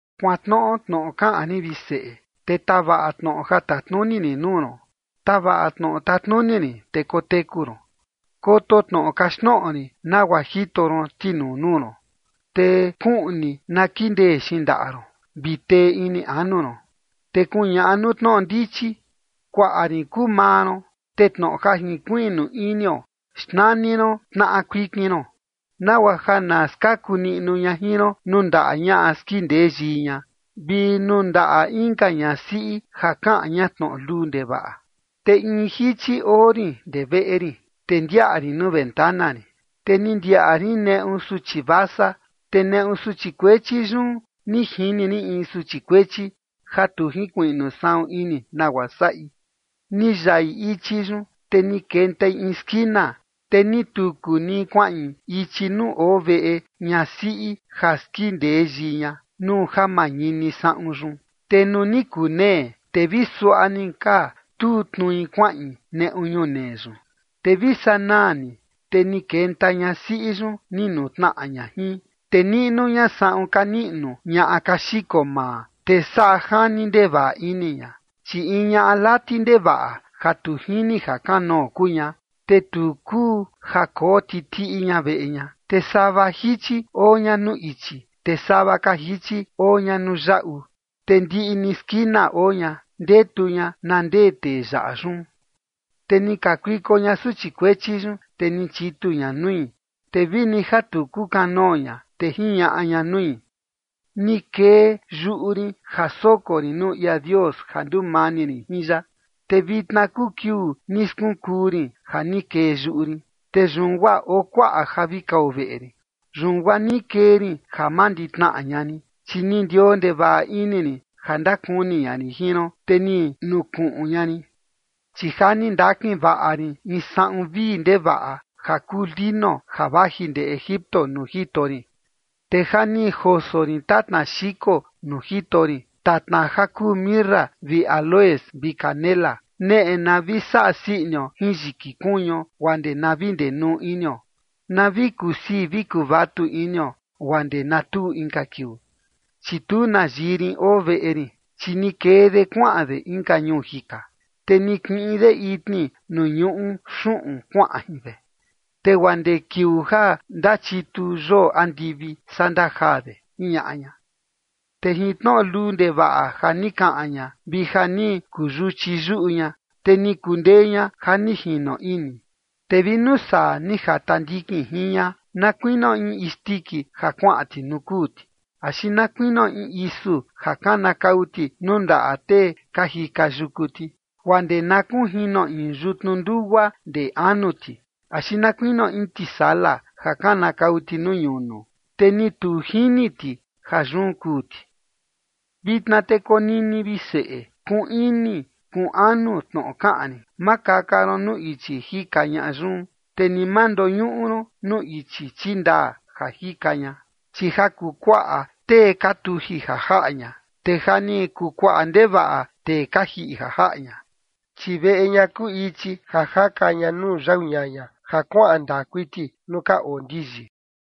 Kuantnoꞌo tnoꞌo kaꞌan rin, vi seꞌe, te tavaꞌa tnoꞌo ja tatnuni rin nuu ron. Tavaꞌa tnoꞌo tatnuni rin, te koteku ron, koto tnoꞌo kaxtnoꞌo rin nagua jito ron tinuu nuu ron. Te kuꞌni na kindee xindaꞌa ron, vi tee ini anu ron. Te kuñaꞌa nuu tnoꞌo ndichi: “Kuaꞌa rin kuu maa ron”. Te tnoꞌo ja jinkuiꞌnu inio xnani ron tnaꞌa kuikin ron, nagua ja na skaku niꞌnu ña jin ron nuu ndaꞌa ñaꞌa skindee yii ña vi nuu ndaꞌa inka ñasiꞌi ja kaꞌan ña tnoꞌo luu ndevaꞌa. Te in jichi oo rin ndee veꞌe rin, te ndiaꞌa rin nuu ventana rin. Te ni ndiaꞌa rin neꞌu suchi vasa, te neꞌu suchi kuechi yun ni jini rin in suchi kuechi ja tu jinkuiꞌnu saꞌun ini nagua saꞌi. Ni yaꞌi ichi yun, te ni kentai in skina, te ni tuku ni kuaꞌin ichi nuu oo veꞌe ñasiꞌi ja skindee yii ña nuu ja mañini saꞌun yun. Te nuu ni kunee, te vi suaꞌa ni ka tuu tnui kuaꞌin neꞌu ñunee yun. Te vi sanaa ni, te ni kenta ñasiꞌi yun, ni nutnaꞌa ña jin, te niꞌnu ña saꞌun ka niꞌnu ñaꞌa ka xiko maa, te saꞌa jani ndevaꞌa ini ña. Chi in ñaꞌa lati ndevaꞌa ja tu jini jakanoo kuu ña te tu kuu ja koo titiꞌi ña veꞌe ña. Te sava jichi oo ña nuu ichi, te sava ka jichi oo ña nuu yaꞌu, te ndiꞌi ni skina oo ña, ndetu ña na ndee tee yaꞌa yun. Te ni kakuiko ña suchi kuechi yun, te ni chitu ña nui, te vi ni ja tu kukanoo ña, te jiñaꞌa ña nui: “Ni kee yuꞌu rin ja soko rin nuu ia Dios ja ndumani rin jin ya, te vitna kuu kiuu ni skunkuu rin ja ni kee yuꞌu rin. Te yun guaa oo kuaꞌa ja vi kao veꞌe rin. Yun guaa ni kee rin ja manditnaꞌa ña rin, chi ni ndioo ndevaꞌa ini rin ja ndakuni ña rin jin ron, te ni nukuꞌun ña rin. Chi ja ni ndakin vaꞌa rin in saꞌun vii ndevaꞌa ja kuu lino ja vaji ndee Egipto nuu jito rin. Te ja ni joso rin tatna xiko nuu jito rin, tatna ja kuu mirra vi áloes vi canela. Neꞌe na vi saꞌa sii inio jin yiki kuñuo guaa ndee na vi ndenuu inio, na vi kusii vi kuvatu inio guaa ndee na tuu inka kiuu. Chi tu na yii rin oo veꞌe rin, chi ni kee de kuaꞌan de inka ñuu jika. Te ni kiꞌin de itni nuu ñuꞌu xuꞌun kuaꞌan jin de, te guaa ndee kiuu ja ndachitu yoo andivi, saa ndajaa de”, jiñaꞌa ña. Te jin tnoꞌo luu ndevaꞌa ja ni kaꞌan ña vi ja ni kuu yuchi yuꞌu ña, te ni kundee ña ja ni jino ini. Te vi nuu saa ni jata ndikin jin ña, na kuinio in isndiki ja kuaꞌan ti nuu kuu ti, axi na kuinio in isu ja kanakau ti nuu ndaꞌa tee ka jika yuku ti, guaa ndee na kunjino in yutnu ndugua ndee anu ti, axi na kuinio in tisala ja kanakau ti nuu ñunu, te ni tu jini ti ja yun kuu ti. Vitna te konini, vi seꞌe, kuꞌun ini kuꞌun anu tnoꞌo kaꞌan rin. Ma kaka ron nuu ichi jika ñaꞌa yun, te ni ma ndoñuꞌu ron nuu ichi chindaa ja jika ña. Chi ja kuu kuaꞌa tee ka tuji ja jaꞌa ña, te ja ni kuu kuaꞌa ndevaꞌa tee ka jiꞌi ja jaꞌa ña. Chi veꞌe ña kuu ichi ja jaka ña nuu yau ñaña, ja kuaꞌan ndaa kuiti nuu ka oo ndiyi.